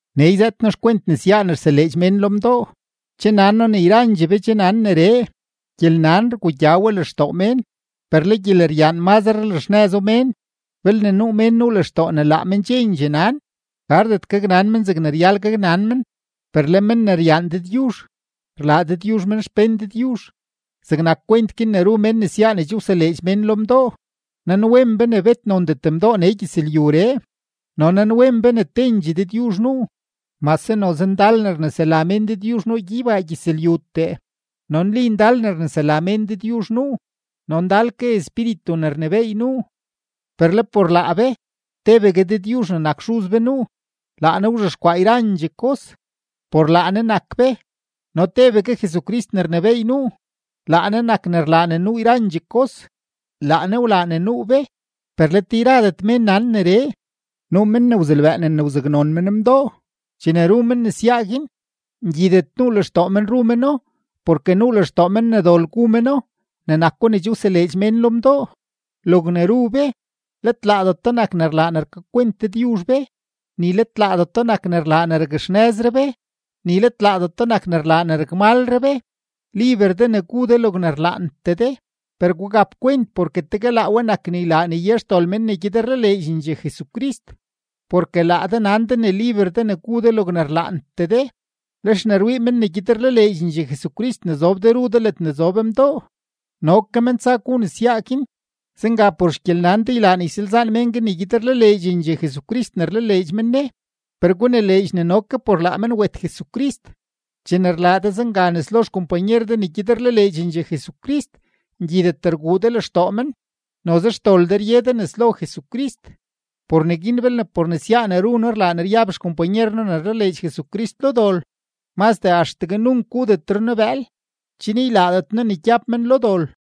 Nee yzëët noo xkwent nesyaa ne rseleedx mén lo mdoo. Che nan noo ne yrandxee be che nan neree. Gyelnan rgugya we lextoo mén, per le gyeleryaan mazre rlaxnëzo mén. Belne nuu mén nuu lextoo ne laa men chendxee nan, gardet gaknan men zegne ryal gaknan men. Per le men ne ryaan Dëdyuzh, rlaa Dëdyuzh men xpén Dëdyuzh. Zegnak kwent guin ne ru mén nesyaa ne che wseleedx mén lo mdoo, nanwen be ne bet nondet mdoo nee gyëzlyuree no nanwen be ne tendxee Dëdyuzh nuu. Mase noze ndal ne rnesela mén dëdyuzh nuu gyeybaa gyëzlyutee, no nli ndal ne rnesela mén dëdyuzh nuu no ndal ke espíritu ne rnebééy nuu, per le por laa be, tebegue Dëdyuzh ne nak Xuz be nuu; laa Ne wzhexkwaa yrandxee kos, por laa Ne nak be. No tebegue Jesucrist ne rnebééy nuu; laa Ne nak ne rlaa ne nuu yrandxee kos, laa Ne wlaa ne nuu be. Per let yradet mén nan neree. Nuu men ne wzelbëënen ne wzaknon men mdoo, chene ru men nesyaa guin, ngyidet nuu lextoo men ru meno porke nuu lextoo men ne dol gu meno ne nako ne che wseleedx mén lo mdoo. Logne ru be, let laadeto nak ne rlaa ne rkakwent Dëdyuzh be; ni let laadeto nak ne rlaa ne rakxnëzre be, ni let laadeto nak ne rlaa ne rakmalre be. Liber de ne gu de logne rlaantee de, per gugap kwent porke tegue laa we nak ne ylaa ne ye xdol mén ne gyed rlaleedxendxee Jesucrist. Porke laa de nan de ne liber de ne gu de logne rlaantee de, lex ne rwii mén ne gyed rlaleedxendxee Jesucrist ne zob de ru de ledne zob mdoo, no ke men tsa gu nesyaa guin. Zenga por xgyelnan de, ylaa ne ysalzaan mén guin ne gyed rlaleedxendxee Jesucrist ne rlaleedx men Ne, per gunileedx ne no ke por laa men wet Jesucrist. Chene rlaa de zenga nes lo xkompanyer de ne gyed rlaleedxendxee Jesucrist, ngyidet rguu de lextoo men, noze xdol de rye de nes lo Jesucrist. Por neguin belne por nesyaa ne ru noo rlaa ne ryab xkompanyer noo ne rlaleedx Jesucrist lo dol, mazdee axtegue nunk gudetre noo bëël, chen ylaadet noo ne gyab men lo dol.